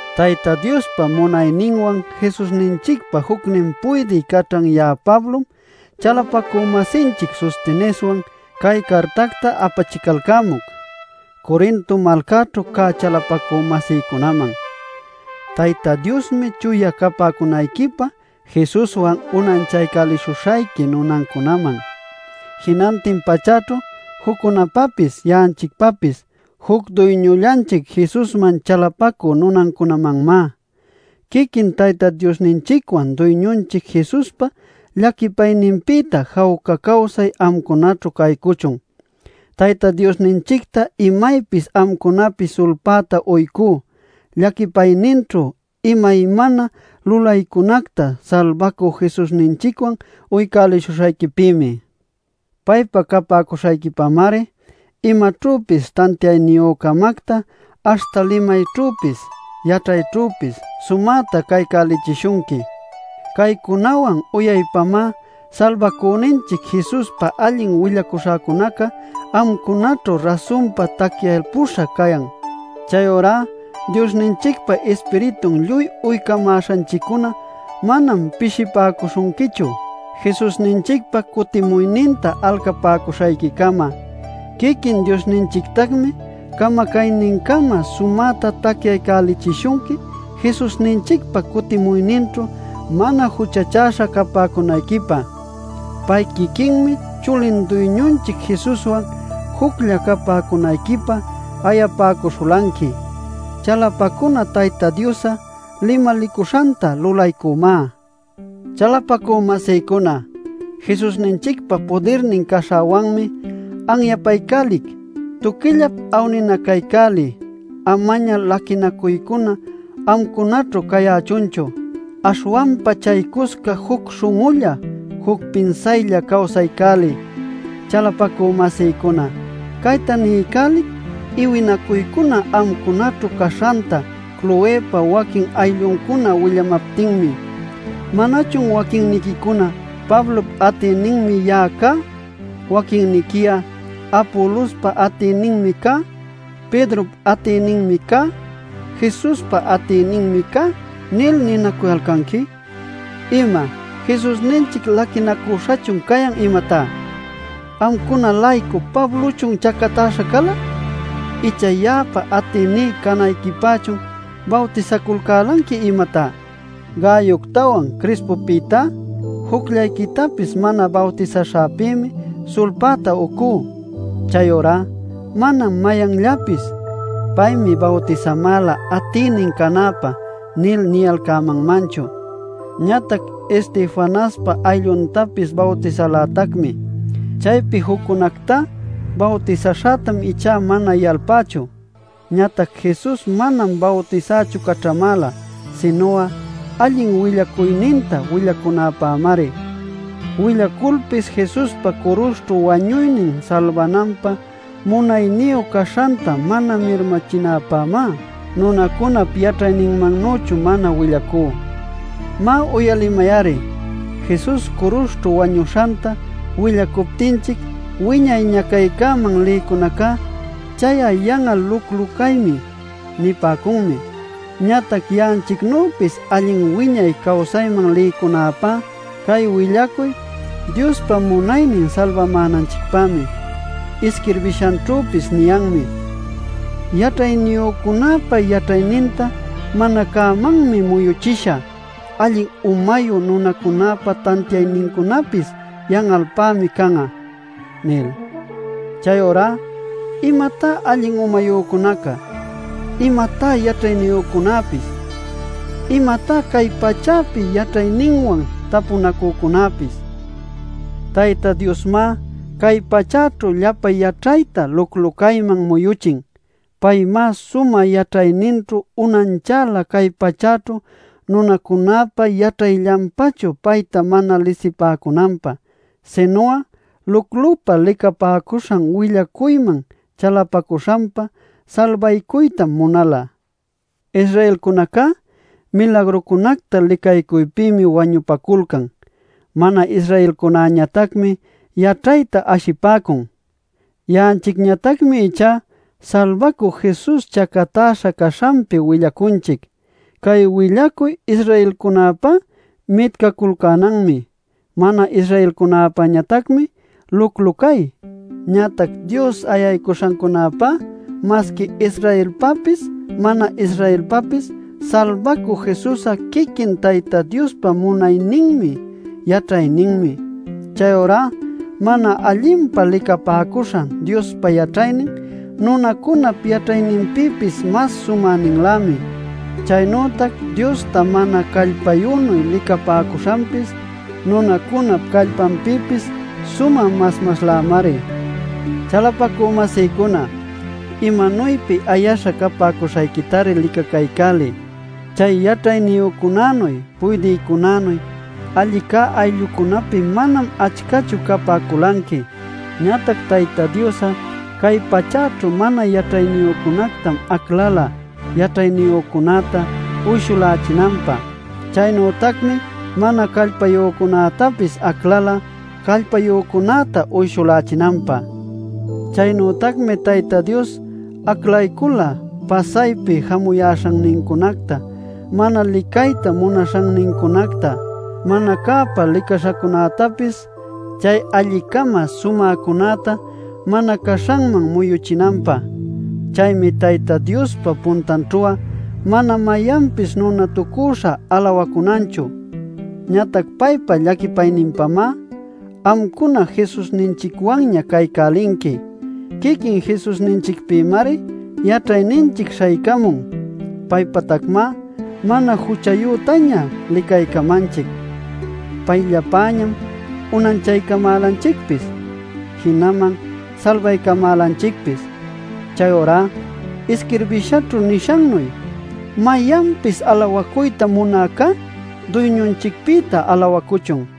Tayta Diospa munayninwan Jesusninchicpa jucnin puydï caćhan ya'a Pablom, chalapacü-masinchic Sosteneswan cay cartacta apachicalcämuc, Corinto malcaćhu cä chalapacü-masïcunaman: Tayta Diosmi chuya capäcunayquipä Jesuswan unanchaycälishuśhayqui nunancunaman; jinantin pachäćhu juccunapapis ya'anchicpapis juc Duyñullanchic Jesusman chalapacü nunancunamanmá. Quiquin Tayta Diosninchicwan Duyñunchic Jesuspa llaquipayninpïta jawca cawsay amcunaćhu caycuchun. Tayta Diosninchicta imaypis amcunapi sulpäta uycú llaquipayninćhu imaymana lulaycunacta Salbacü Jesusninchicwan uycälishuśhayquipïmi. Paypa capäcuśhayquipamari imaćhüpis tantiayniyü-camacta aśhta limayćhüpis yaćhayćhüpis sumäta caycälichishunqui. Caycunawan uyaypamá Salbacüninchic Jesuspa allin willacuśhäcunaca amcunaćhu rasunpa tacyalpuśha cayan. Chayurá Diosninchicpa Ispiritun lluy uycamäśhanchiccuna manam pishipäcuśhunquichu Jesusninchicpa cutimuyninta alcapäcuśhayquicama. Quiquin Diosninchictacmi camacaynincama sumäta tacyaycälichishunqui Jesusninchicpa cutimuyninćhu mana juchachäśha capäcunayquipä. Pay quiquinmi chulin Duyñunchic Jesuswan juclla capäcunayquipä ayapäcuśhulanqui. Chalapacuna Tayta Dios'a limalicuśhanta lulaycunmá. Chalapacü-masïcuna, Jesusninchicpa pudirnin caśhäwanmi anyapaycälic: tuquillap awninacaycäliy. Amaña laquinacuycuna amcunaćhu cayächunchu. Aśhwanpa chaycusca juc śhun'ulla, juc pinsaylla cawsaycäliy. Chalapacü-masïcuna, cayta niycälic iwinacuycuna amcunaćhu caśhanta Cloëpa waquin aylluncuna willamaptinmi. ¿Manachun waquinniquicuna: “Pablop atïninmi ya'a cá”, waquinniqui'a: “Apolospa atïninmi cá”, “Pedrop atïninmi cá”, “Jesuspa atïninmi cá” nil ninacuyalcanqui? ¡¿Ima?! ¿Jesusninchic laquicacüśhachun cayan, imatá? ¿Amcuna-laycu Pablochun chacatäśha cala? Icha ¿ya'apa atïní canayquipächun bawtisaculcälanqui, imatá? Gayoctawan Crispopïtá jucllayquitapis mana bawtisaśhäpïmi sulpäta uycú. Chayurá manam mayanllapis “Paymi bawtisamäla atïnin canäpä” nil niyalcämanmanchu. (Ñatac Estefanaspa aylluntapis bawtisalätacmi. Chaypi juccunactá bawtisaśhätam ichá mana yalpächu.) Ñatac Jesus manam bawtisächu caćhamäla, sinu'a allin willacuyninta willacunäpämari. Willaculpis Jesuspa curuśhćhu wañuynin salbananpä munayniyu caśhanta mana mirmachinäpämá nunacunap yaćhayninmannüchu mana willacú. Má, uyalimay-ari: Jesus curuśhćhu wañuśhanta willacuptinchic wiñay ñacaycäman lïcunaca “Chay'a yan'al luclu-caymi” nipäcunmi. Ñatac ya'anchicnüpis allin wiñay cawsayman lïcunäpá cay willacuy Diospa munaynin salbamänanchicpämi. Isquirbishanćhüpis niyanmi: “Yaćhayniyücunäpa yaćhayninta mana cämanmi muyuchishä; Allin umayu nunacunäpa tantiaynincunapis yan'alpämi can'a” nil. Chayurá ¿imatá alli umayücunaca? ¿Imatá yaćhayniyücunäpis? ¿Imatá cay pachäpi yaćhayninwan tapunacücunäpis? ¡Tayta Diosmá cay pachäćhu llapa yaćhayta luclu-cayman muyüchin! Paymá sumä yaćhayninćhu unanchäla cay pachäćhu nunacunäpa yaćhayllanpachu payta mana lisipäcunanpä. Sinu'a luclupä licapäcuśhan willacuyman chalapacuśhanpa salbaycuytam munala. Israelcunacá milagrucunacta licaycuypïmi wañupaculcan; mana-Israelcunäñatacmi yaćhayta ashipäcun. Ya'anchicñatacmi ichá Salbacü Jesus chacatäśha caśhanpi willacunchic. Cay willacuy Israelcunäpá mitcaculcänanmi. Mana-Israelcunäpäñatacmi luclu-cay. Ñatac Dios ayaycuśhancunäpá masqui Israelpäpis, mana-Israelpäpis Salbacü Jesus'a quiquin Tayta Diospa munayninmi, yaćhayninmi. Chayurá mana allinpa licapäcuśhan Diospa yaćhaynin, nunacunap yaćhayninpïpis mas sumäninlämi. Chaynütac Diosta mana callpayünuy licapäcuśhanpis, nunacunap callpanpïpis sumä mas maslämari. Chalapacü-masïcuna, imanuypi ayaśha capäcuśhayquitari licacaycäliy. Chay yaćhayniyücunanuy, puydïcunanuy, alli cä ayllucunapi manam achcachu capäculanqui. Ñatac Tayta Dios'a cay pachäćhu mana yaćhayniyücunactam aclala, yaćhayniyücunäta uyshulächinanpä. Chaynütacmi mana callpayücunätapis aclala callpayücunäta uyshulächinanpä. Chaynütacmi Tayta Dios aclaycula pasaypi jamuyäśhannincunacta, mana licayta munaśhannincunacta, mana cäpa licaśhacunätapis chay alli-cama sumäcunäta mana caśhanman muyuchinanpä. Chaymi Tayta Diospa puntanćhu'a mana mayanpis nunatucüśha alawacunanchu. Ñatac paypa llaquipayninpamá amcuna Jesusninchicwanña caycälinqui. Quiquin Jesusninchicpïmari yaćhayninchic śhaycamun. Paypatacmá mana juchayütaña licaycamanchic; payllapäñam unanchaycamälanchicpis, jinaman salbaycamälanchicpis. Chayurá isquirbishaćhu nishannuy “Mayanpis alawacuyta munäcá Duyñunchicpïta alawacuchun”.